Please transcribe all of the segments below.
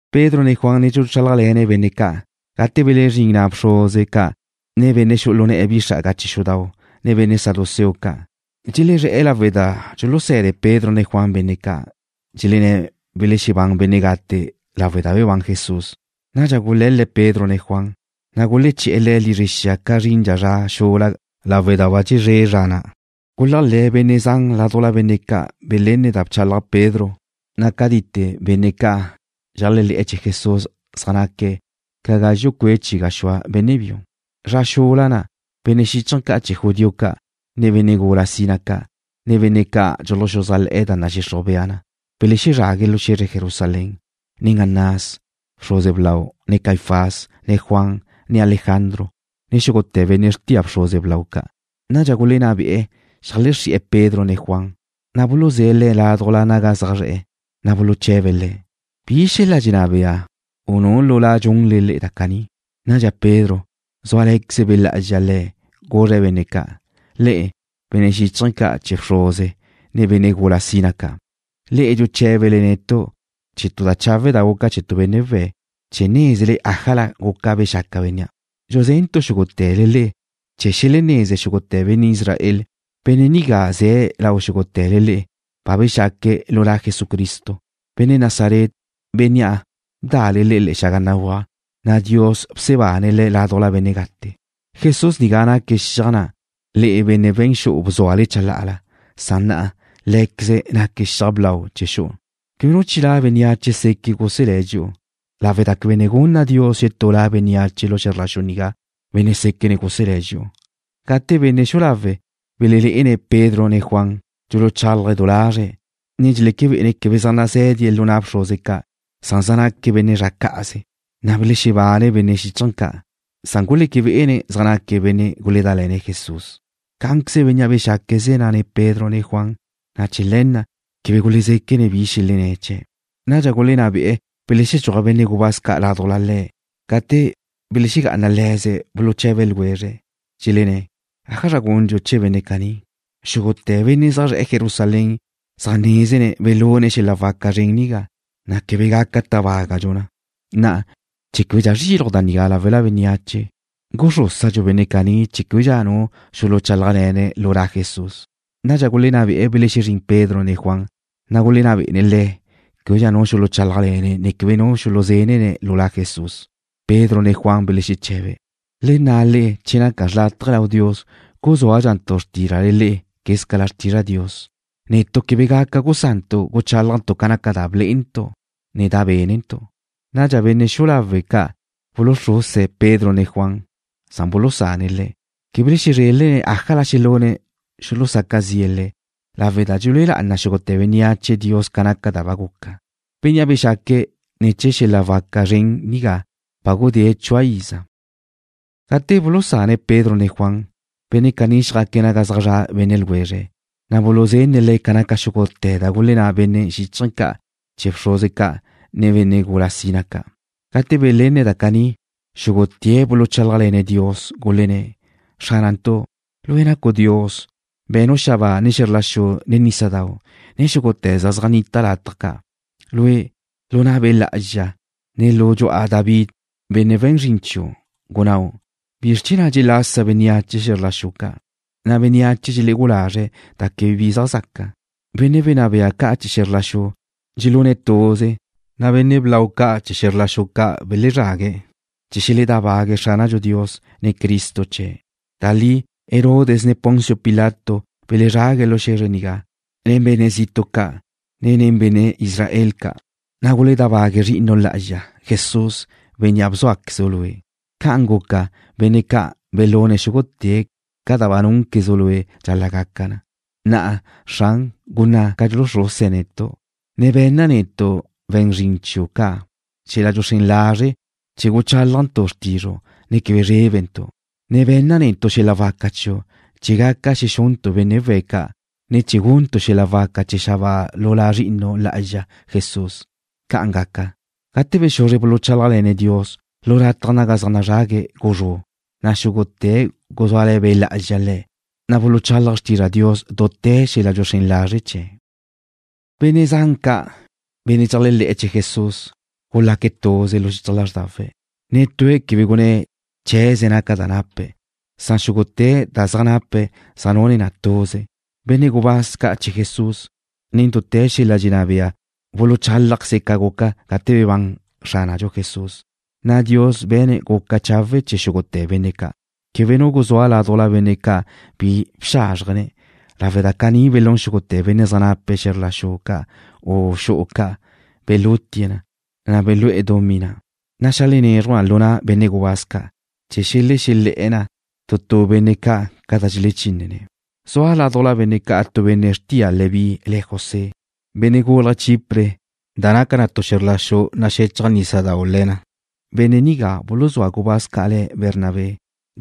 Pedro ne Juan ne dxuluchálajle̱ne̱' benne' ca' gate belezrín na' bxruze ca', ne benne' xu'u lu ne̱'e̱ bi xra'aga chee̱ xudau', ne benne' saduceo ca'. Dxelezré̱'e̱ lawe' da dxuluse̱de Pedro, ne Juan benne' ca', dxelenné̱' welexebán benne' gate lawe' da bebán Jesús. Nadxa gule̱l-le̱' Pedro ne Juan, na' guleché̱'e̱ le̱' lizre xia ca zrindxa zra xula lawe' da ba dxezré' zra na'. Guléajle̱' benne' zan ládujla benne' ca' belénne̱' da bchalaj Pedro, na' cátite benne' ca' dxeléajle̱'e̱ chee̱ Jesús zaj naque̱' ca gazxu' cue' chi gaxúa benne' biu. Zra xula na' benne' xíchaje̱ ca' chee̱ judío ca', ne benne' gula sina ca', ne benne' ca' dxuluxuzájle̱'e̱ da nadxixruj bea na, belezrague̱' lu xe̱zre Jerusalén nen Anás, bxruze blau, ne Caifás, ne Juan, ne Alejandro, ne xúgute̱ benne' xrtia bxruze blau ca'. Nadxa gulenná be'e xeajlexrí'e̱ Pedro ne Juan, na' buluzé̱' le̱' laduj naga zaj zre̱'e̱, na' buluche̱be̱' le̱': ―¿Bi xel-la' dxenná bea, u nu lu La dxunle da caní? Nadxa Pedro, zúale̱queze Be' Lá'azxa le̱', guzre̱' benne' ca': ―Le'e, benne' xíchaje̱ ca' chee̱ bxruze, ne benne' gula sina ca', le'e dxuché̱bele netu' chee̱ tu da chawe' da guca chee̱ tu benne' we̱', chee̱ nézele ájala guca bexaca bénnea'. Dxuzentu' xúgute̱le le'e chee̱ xeleneze xúgute̱ benne' Israel, benne' nigá ze̱' lau xúgute̱le le'e, ba bexaque̱' lu La Jesucristo, Benne' Nazaret, Bénnea' bda'le le'e le̱'e̱ xaga béguaj, na' Dios bsebane̱' Le̱' ládujla benne' gate. Jesús nigá naque̱' xiaj na', le'e, benne' we̱n xu'u bzúale chalá'ala, san na'a Lé̱queze̱' naque̱' xiaj blau chee̱ xu'u. Quebe nu chilá' bénneache seque' guselé̱' dxi'u lawe' da quebe ne gunna Dios xetú La bénneache lu xe̱zr la xu nigá, benne' séquene̱' guselé̱' dxi'u. Gate benne' xu'u lawe' belelé'ene̱' Pedro ne Juan dxuluchálaje̱' du lazre̱', ne dxeleque bé'ene̱' quebe zaj nazé̱die̱' lu na' bxruze ca', san zaj naque̱' benne' zre̱'e̱ cá'aze, na' belexebáne benne' xíchaje̱ ca', san guleque bé'ene̱' zaj naque̱' benne' guledále̱ne̱' Jesús. Cá'anqueze bénnea' bexaque̱' ze̱' na' nen Pedro ne Juan, na' chee̱ le̱ na' quebe gulezéquene̱' bi xelenné̱' chee̱'. Nadxa gulenná be'e̱ belexedxúaj benne' gubáz ca' ládujla le̱'. Cate' belexegá'ana le̱ze̱' buluche̱be ljwezre̱', dxelenné̱': ―¿Ájazra gundxu chee̱ benne' caní? Xúgute̱ benne' zaj zre̱'e̱ Jerusalén zaj nézene̱' belune̱' xel-la' waca zren nigá, na' quebe gaca tábagadxu na. Na'a, chee̱ québedxa zriluj da nigá láwela bénneache, guxrúsadxu benne' caní chee̱ québedxa nu xuluchálajle̱ne̱' lu La Jesús. Nadxa gulenná be'e̱ belexezrín Pedro ne Juan, na' gulenná bé'ene̱' le̱' québedxa nu xuluchálajle̱ne̱', ne quebe nu xulusé̱dene̱' lu La Jesús. Pedro ne Juan belexeche̱be̱': ―Le nna' le'e che naca xrlátaje lau Dios guzúazrantu' xrtízrale le'e, quézcala xrtizra' Dios. Netu' quebe gaca gusantu' gucháljantu' ca naca da blé'entu', ne da bénentu'. Nadxa benne' xu'u lawe' ca' buluxruse̱' Pedro ne Juan, san bulusane̱' le̱'. Quebe belezrelne̱' ájala xelune̱' xuluzaca zi'e̱ le̱' lawe' da dxelúe lá'ana xúgute̱ bénneache Dios ca naca da ba guca. Bénnea' bexaque̱' ne̱ chee̱ xel-la' waca zren nigá ba gudée̱' chua iza. Gate bulusane̱' Pedro ne Juan, benne' caní xjaque̱' naga zaj zra' benne' ljwezre̱', na' buluzenne̱' le̱' ca naca xúgute̱ da gulenná benne' xíchaje̱ ca' chee̱ bxruze ca', ne benne' gula sina ca'. Gate belenne̱' da caní, xúgute̱' buluchálajle̱ne̱' Dios, gulenné̱': ―Xránantu', Lue' nacu' Dios. Be̱nu' xabáa, ne xe̱zr la xu, ne nísadau', ne xúgute̱ da zaj nnita lataj ca'. Lue', lu na' Be' Lá'azxa, ne lu dxu'a David, benne' we̱n zrin chiu', gunnáu': ¿Bizr chee̱ na' dxelasa bénneache xe̱zr la xu ca', na' bénneache dxelegú'u lazre̱' da quebe bi zaj zaca? Benne' wenná bea ca' chee̱ xe̱zr la xu gulune̱' tuz, na' benne' blau ca' chee̱ xe̱zr ca' belezrague̱' chee̱ xeledábague̱'e̱ Xránadxu Dios, ne Cristo chee̱'. ’Da li, Herodes. ne Poncio Pilato belezrague̱' lu xe̱zre nigá nen benne' zitu' ca', ne nen benne' Israel ca', na' guledábague̱' Zri'inu' Lá'azxa, Jesús, Bénnea' bzúaquezu' Lue'. Ca'an guca, benne' ca' belune̱' xúgute̱ ca da ba núnquezu' Lue' dxal-la' gaca na. Na'a, Xran, gunná' ca dxuluxruse̱' netu', ne be̱nna netu', we̱n zrin chiu' ca', xel-la' dxuxrén lazre' chee̱ guchálajntu' xrtizru', ne quebe zrébentu', ne be̱nna netu' xel-la' waca chiu' chee̱ gaca xexuntu' benne' we̱' ca', ne chee̱ guntu' xel-la' waca chee̱ xabáa lu La Zri'inu' Lá'azxa Jesús. ¡Ca'an gaca! Gate bexuzre buluchálajle̱ne̱' Dios, lu lataj naga zaj nazrague̱' guzrú', na' xúgute̱' guzúale̱ Be' Lá'azxa le̱', na' buluchálaje̱' xrtizra' Dios dute̱ xel-la' dxuluxrén lazre' chee̱'. Benne' zan ca', benne' dxeléajle̱'e̱ chee̱ Jesús gulaque̱' tuze lu xichaj lázrdawe̱'. Netúe̱' quebe gunné̱' chee̱ze̱' naca da nape̱'. Xúgute̱ da zaj nape̱' zaj nune̱' tuze. Benne' gubáz ca' chee̱ Jesús, nen dute̱ xel-la' dxelenná bea buluchálajqueze̱' ca guca gate bebán Xránadxu Jesús, na' Dios be̱ne̱' guca chawe' chee̱ xúgute̱ benne' ca'. Quebe nu guzúa ládujla benne' ca' bi bxázrjene̱' lawe' da caní belún xúgute̱ benne' zaj nape̱' xe̱zr la xu ca' u xu'u ca'. Belutie̱' na, na' belú'e̱ dumí na', ne xeajlenézruje̱' na lu na' benne' gubáz ca', chee̱ xelexele̱'e̱ na tu tu benne' ca' ca da dxelechínene̱'. Zua ládujla benne' ca' tu benne' xrtia Leví le̱' José, benne' gúlaje̱' Chipre da naca tu xe̱zr la xudau' naxechaj nísadau' le̱ na. Benne' nigá, buluzúa gubáz ca' le̱' Bernabé,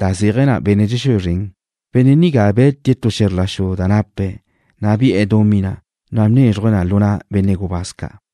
da zéaje̱ na benne' dxexúe zrene̱'. Benne' nigá be̱tie̱' tu xe̱zr la xu da nape̱', na' bi'e̱ dumí na', ne bnézruje̱' na lu na' benne' gubáz ca'.